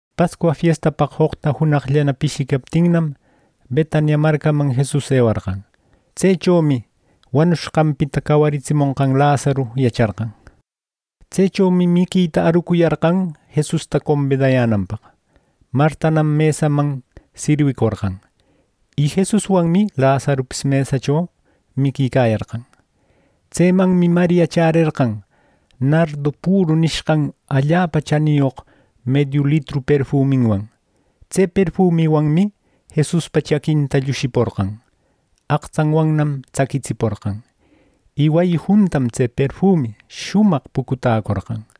Pascua fiestapaq joqta junaqllana pishicaptinnam, Betania marcaman Jesus ewarqan. Tsechomi wanushqanpita cawaritsimonqan Lazaru yacharqan. Tsechomi miquita arucuyarqan Jesusta combidayänanpaq. Martanam mesaman sirwicorqan. Y Jesuswanmi Lazarupis mesacho miquicayarqan. Tsemanmi Maria chärerqan nardu püru nishqan allapa chaniyoq mediu litru perfuminwan. Tse perfumiwanmi Jesuspa chaquinta llushiporqan. Aqtsanwannam tsaquitsiporqan. Y wayi juntam tse perfumi shumaq pucutäcorqan.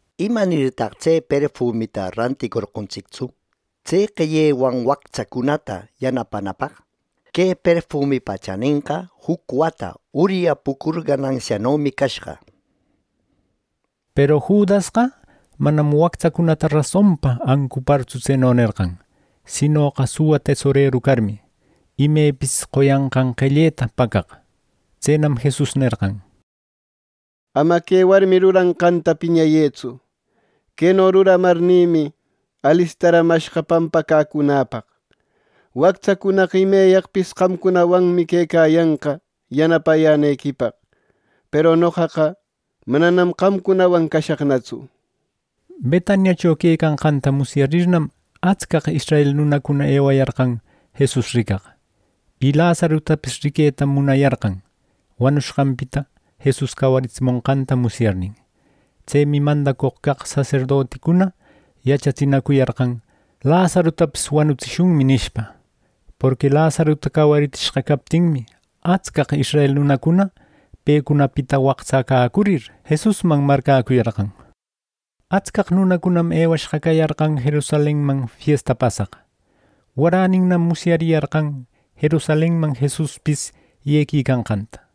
—¿Imanirtaq tse perfumita ranticorqontsictsu, tse qellewan wactsacunata yanapanapaq! Que perfumipa chanenqa juc wäta uryapucur ganansianomi cashqa —nir. Peru Judasqa manam wactsacunata rasonpa ancupartsu tseno nerqan, sinoqa suwa tesoreru carmi, imepis qoyanqan qelleta pacaq. Tsenam Jesus nerqan: —Ama que warmi ruranqanta piñëtsu, queno ruramarnïmi alistaramashqa pampacäcunäpaq. Wactsacunaqa imeyaqpis qamcunawanmi quecayanqa yanapayänequipaq, peru noqaqa mananam qamcunawan cashaqnatsu —nir. Betaniacho quecanqanta musyarirnam, atscaq israel nunacuna ewayarqan Jesus ricaq. Y Lazarutapis riquetam munayarqan, wanushqanpita Jesus cawaritsimonqanta musyarnin. Tsemi mandacoq caq saserdoticuna yachatsinacuyarqan “Lazarutapis wanutsishunmi” nishpa. Porqui Lazaruta cawaritsishqa captinmi, atscaq israel nunacuna pecunapita waqtsacäcurir, Jesusman marcäcuyarqan. Atscaq nunacunam ewashqa cayarqan Jerusalenman fiesta pasaq. Waräninnam musyariyarqan Jerusalenman Jesuspis yequicanqanta.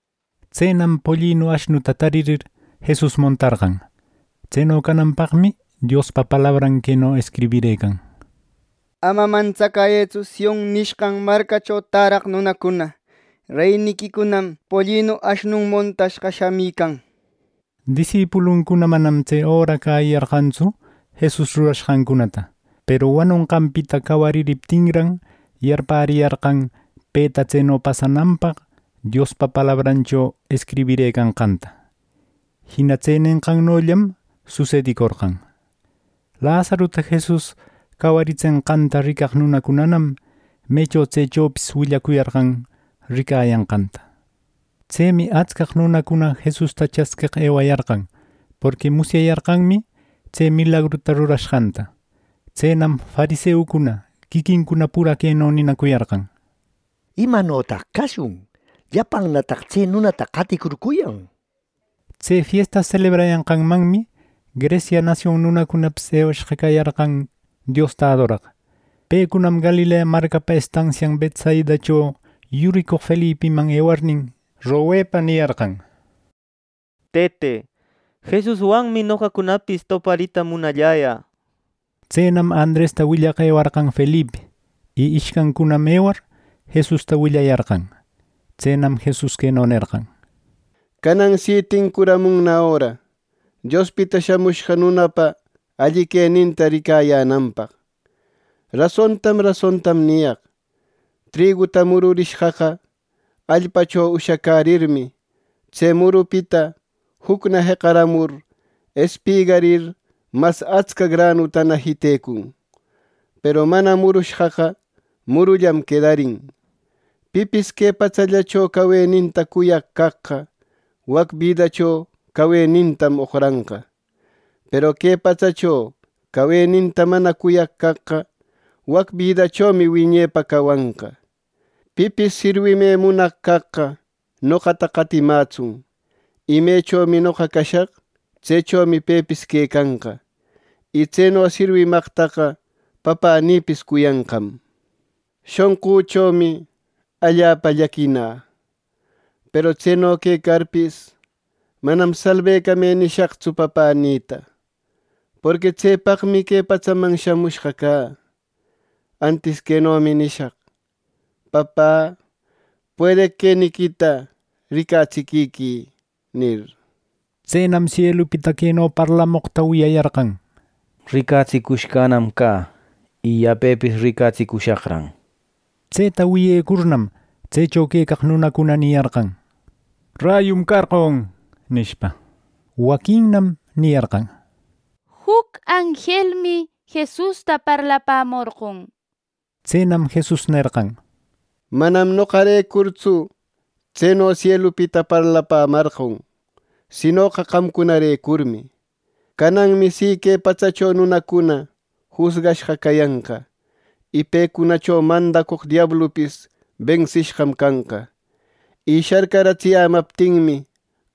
Tsenam pollinu ashnuta taririr, Jesus montarqan. Tseno cananpaqmi Diospa palabran queno escribirëcan: “Ama mantsacuyëtsu, Sion nishqan marcacho täraq nunacuna. Reyniquicunam pollinu, ashnun montashqa shamican” nishpa. Disipuluncuna manam tse öra cäyiyarqantsu Jesus rurashqancunata, peru wanonqanpita cawaririptinran, yarpäriyarqan peta tseno pasananpaq Diospa palabrancho escribirëcanqanta. Jina tse nenqannollam susedicorqan. Lazaruta Jesus cawaritsenqanta ricaq nunacunanam mecho tsechopis willacuyarqan ricayanqanta. Tsemi atscaq nunacuna Jesusta chasqueq ewayarqan porqui musyariyarqanmi tse milagruta rurashqanta. Tsenam fariseucuna quiquincuna pura queno ninacuyarqan: —¿Imanotaq cashun! ¡Llapannataq tse nunata qaticurcuyan! —nir. Tse fiesta selebrayanqanmanmi Grecia nasion nunacunapis ewayashqa cayarqan Diosta adoraq. Pecunam Galilea marcapa estansian Betsaidacho yuricoq Felipiman ewarnin, mañepa niyarqan: —Tëte, Jesuswanmi noqacunapis toparita munalläyä —nir. Tsenam Andresta willaq ewarqan Felipi. Y ishcancunam ewar, Jesusta willayarqan. Tsenam Jesus queno nerqan: —Canan si tincuramunna öra Diospita Shamushqa Nunapa alli queninta ricayänanpaq. Rasontam rasontam niyaq: Triguta mururishqaqa allpacho ushacärirmi, tse murupita jucna jeqaramur espigarir, mas atsca granutana jitecun; peru mana murushqaqa murullam quedarin. Pipis que patsallacho caweninta cuyaq caqqa, wac bidacho cawenintam oqranqa; peru que patsacho caweninta mana cuyaq caqqa, wac bidachomi wiñepa cawanqa. Pipis sirwimë munaq caqqa noqata qatimätsun. Y mechomi noqa cashaq, tsechomi pepis quecanqa; y tseno sirwimaqtaqa Papänïpis cuyanqam. “¡Shonqüchomi allapa llaquina! Peru tseno quecarpis, manam ‘Salbecamë’ nishaqtsu Papänïta, porqui tsepaqmi que patsaman shamushqa cä. Antis quenomi nishaq: ‘Papä, ¡puedeq queniquita ricatsiquiquï!’ nir. Tsenam sielupita queno parlamoqta wiyayarqan: “¡Ricatsicushqanam cä! Y yapepis ricatsicushaqran” neqta. Tseta wiyecurnam, tsecho quecaq nunacuna niyarqan: —Rayum carqon —nishpa. Waquinnam niyarqan: —Juc anjelmi Jesusta parlapämorqon —nir. Tsenam Jesus nerqan: —Manam noqarecurtsu tseno sielupita parlapämarqon, sinoqa qamcunarecurmi. Cananmi si que patsacho nunacuna jusgashqa cayanqa; y pecunacho mandacoq diablupis bensishqam canqa. Y sharcaratsiyämaptinmi,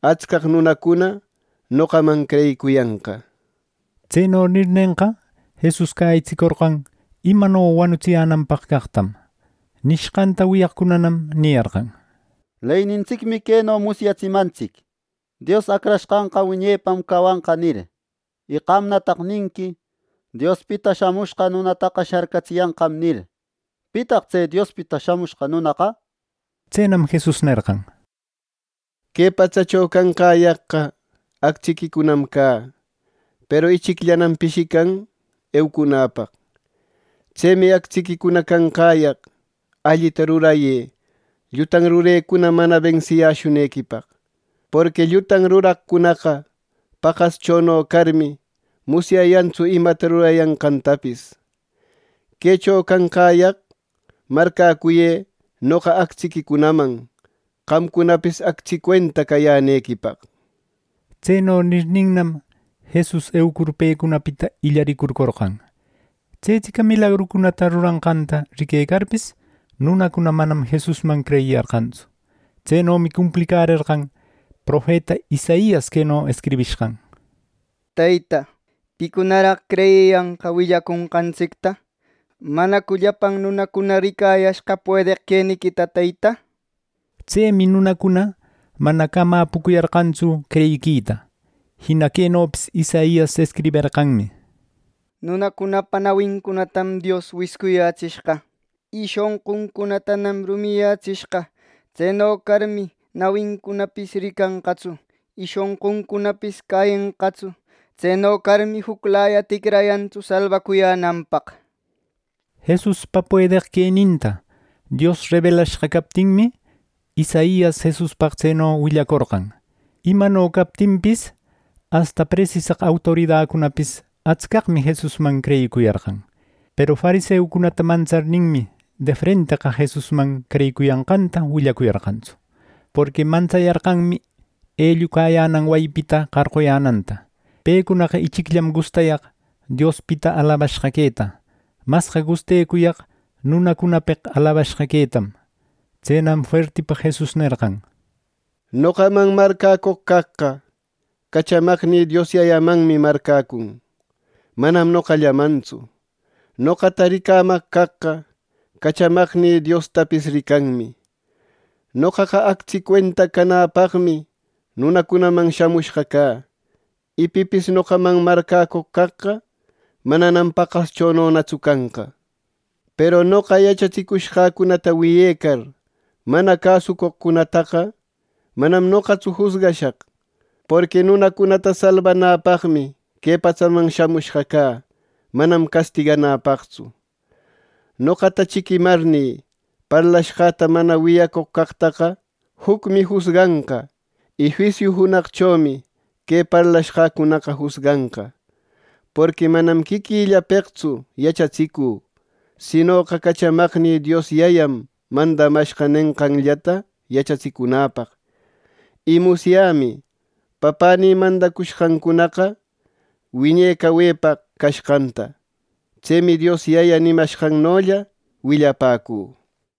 atscaq nunacuna noqaman creyicuyanqa —nir. Tseno nirnenqa, Jesus cäyitsicorqan imano wanutsiyänanpaq caqtam. Nishqanta wiyaqcunanam niyarqan: —Leynintsicmi queno musyatsimantsic: ‘Dios Acrashqanqa wiñepam cawanqa’ nir. Y qamnataq ninqui, ‘Diospita Shamushqa Nunataqa sharcatsiyanqam’ nir. ¿Pitaq tse Diospita Shamushqa Nunaqa? Tsenam Jesus nerqan: —Que patsacho canqäyaqqa actsiquicunam cä, peru ichicllanam pishican eucunäpaq. Tsemi actsiquicuna canqäyaq allita rurayë llutan rurecuna mana bensiyäshunequipaq. Porqui llutan ruraqcunaqa paqaschono carmi, musyayantsu imata rurayanqantapis. Quecho canqäyaq marcäcuyë noqa actsiquicunaman, qamcunapis actsi cuenta cayänequipaq —nir. Tseno nirninnam, Jesus eucur pecunapita illaricurcorqan. Tsetsica milagrucunata ruranqanta riquecarpis, nunacuna manam Jesusman creyiyarqantsu. Tsenomi cumplicärerqan profeta Isaias queno escribishqan: “Teyta, ¿picunaraq creyiyanqa willaconqantsicta? ¿Manacu llapan nunacuna ricayashqa puedeq queniquita, Teyta?” nir. Tsemi nunacuna mana camapucäyarqantsu creyiquita. Jina quenopis Isaias escriberqanmi: “Nunacunapa nawincunatam Dios wiscuyätsishqa, y shonquncunatanam rumiyätsishqa. Tseno carmi, nawincunapis ricanqatsu y shonquncunapis cäyenqatsu. Tseno carmi juclaya ticrayantsu salbacuyänanpaq” nir. Jesuspa puedeq queninta Dios rebelashqa captinmi, Isaias Jesuspaq tseno willacorqan. Imano captinpis, asta presisaq autoridacunapis atscaqmi Jesusman creyicuyarqan. Peru fariseucunata mantsarninmi, defrenteqa Jesusman creyicuyanqanta willacuyarqantsu, porqui mantsayarqanmi ellucayänan wayipita qarquyänanta. Pecunaqa ichicllam gustayaq Diospita alabashqa queta; masqa gustecuyaq nunacunapeq alabashqa quetam. Tsenam fuertipa Jesus nerqan: “Noqaman marcäcoq caqqa, cachamaqnï Dios Yayamanmi marcäcun; manam noqallamantsu. Noqata ricamaq caqqa, cachamaqnï Diostapis ricanmi. Noqaqa actsi cuenta canäpaqmi nunacunaman shamushqa cä. Y pipis noqaman marcäcoq caqqa, mananam paqaschononatsu canqa. “Peru noqa yachatsicushqäcunata wiyecar, mana cäsucoqcunataqa manam noqatsu jusgashaq; porqui nunacunata salbanäpaqmi que patsaman shamushqa cä, manam castiganäpaqtsu. Noqata chiquimarnï, parlashqäta mana wiyacoq caqtaqa, jucmi jusganqa. Y juisiu junaqchomi que parlashqäcunaqa jusganqa. Porqui manam quiquillapeqtsu yachatsicü, sinoqa cachamaqnï Dios Yayam mandamashqa nenqanllata yachatsicunäpaq. Y musyämi Papänïpa mandacushqancunaqa wiñe cawepaq cashqanta. Tsemi Dios Yaya nimashqannolla willapäcü” nir.